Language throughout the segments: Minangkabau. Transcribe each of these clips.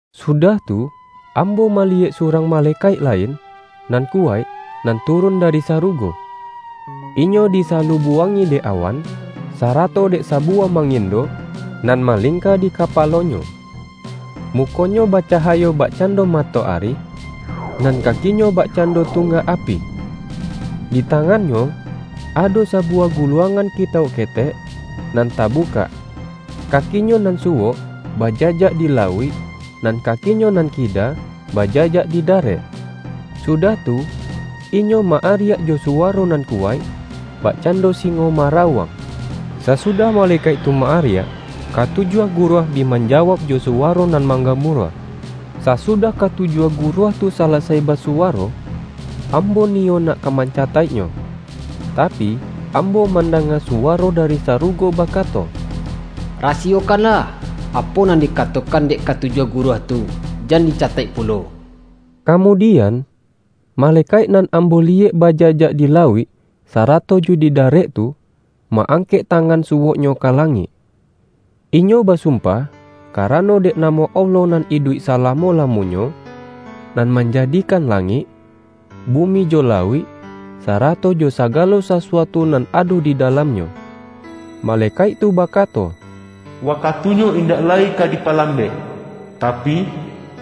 Sudah tu, ambo maliyek su-rang malekaik lain nan ku-waik, nan turun dari sarugo. Inyo disalubuangi dek awan, sarato dek sabuwah mangindo, nan malingka di kapalonyo. Mukonyo bacahayo bak-cando matoari, nan kakinyo bakcan-do tunggak api. Di tangannyo, ado sabuwah guluangan kitauk ketek, nan tabukak. Kakinyo nan suwok bajajak di lauik, nan kakinyo nan kida bajajak di darek. Sudah tu, inyo ma-ariak jo suwaro nan kuwaik, bakcando singo marauang. Sasudah malekaik tu ma-ariak, katujuah guruah bi manjawauk jo suwaro nan manggamuruah. Sa-sudah katujuah guruah tu salasai ba-suwaro, ambo niyo nak ka mancataik-nyo, tapi, ambo mandanga suwaro dari sarugo bakato,”Rasiyokanlah, apo nan dikatokan dek katujuah gu-ruah tu; jan dicataik pulo!” Kamudian, malekaik nan ambo li-yek bajajak di lauik sarato jo di da-rek tu, ma-angkek tangan suwoknyo ka langik. Inyo basumpah karano dek namo Allah nan iduik salamo-la-monyo, nan manjadikan langik, bumi jo lauik, sarato jo sagalo sasuatu nan ado di dalamnyo. Malekaik tu baka-to,”Wakatunyo indak lai ka dipalam-bek! Tapi,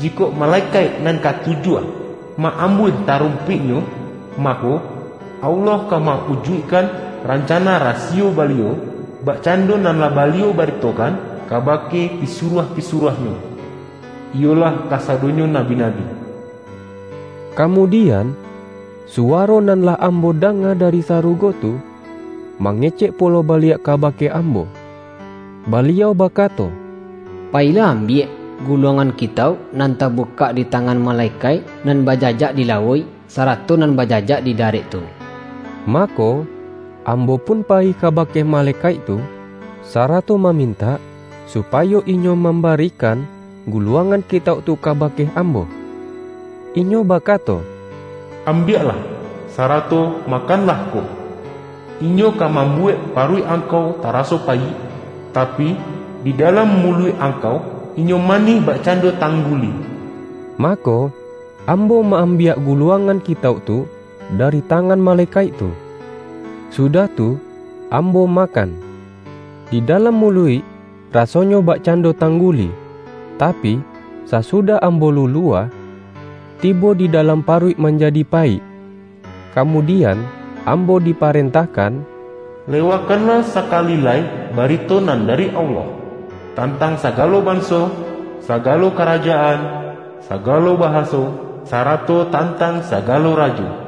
jikok malekaik nan katu-juah ma-ambuih tarumpiknyo, mako, Allah ka ma-ujuikkan rancana rasiyo Baliau, bakcando nan lah Baliau bari-tokan kabake pisuruah-pisuruah-Nyo, iyolah kasadonyo nabi-nabi.” Kamudian, suwaro nan lah ambo danga da-ri sarugo tu, mangecek pulo baliak ka-bake ambo. Baliau bakato,”Payilah ambiak, guluangan kitauk nan tabu-kak di tangan malekaik nan bajajak di lauik, sarato nan bajajak di darek tu.” Mako, ambo pun payi kabake ma-lekaik tu, sarato mamintak, supayo inyo mambarikan guluangan kitauk tu kabake ambo. Inyo bakato,”Am-biaklah, sarato makanlah ko. Inyo ka mambuwek paruik angkau taraso payik, tapi, di dalam muluik angkau inyo manih bakcando tangguli.” Mako, ambo ma-ambiak guluang-an kitauk tu dari tangan malekaik tu, sudah tu, ambo makan. Di dalam mu-luik rasonyo bakcando tangguli, tapi, sasudah ambo lulua, tibo di dalam pa-ruik manjadi payik. Kamudian, am-bo diparentahkan,”Lewakanlah saka-li lai barito nan dari Allah, tantang sagalo banso, sagalo karajaan, sagalo bahaso, sarato tantang sagalo rajo.”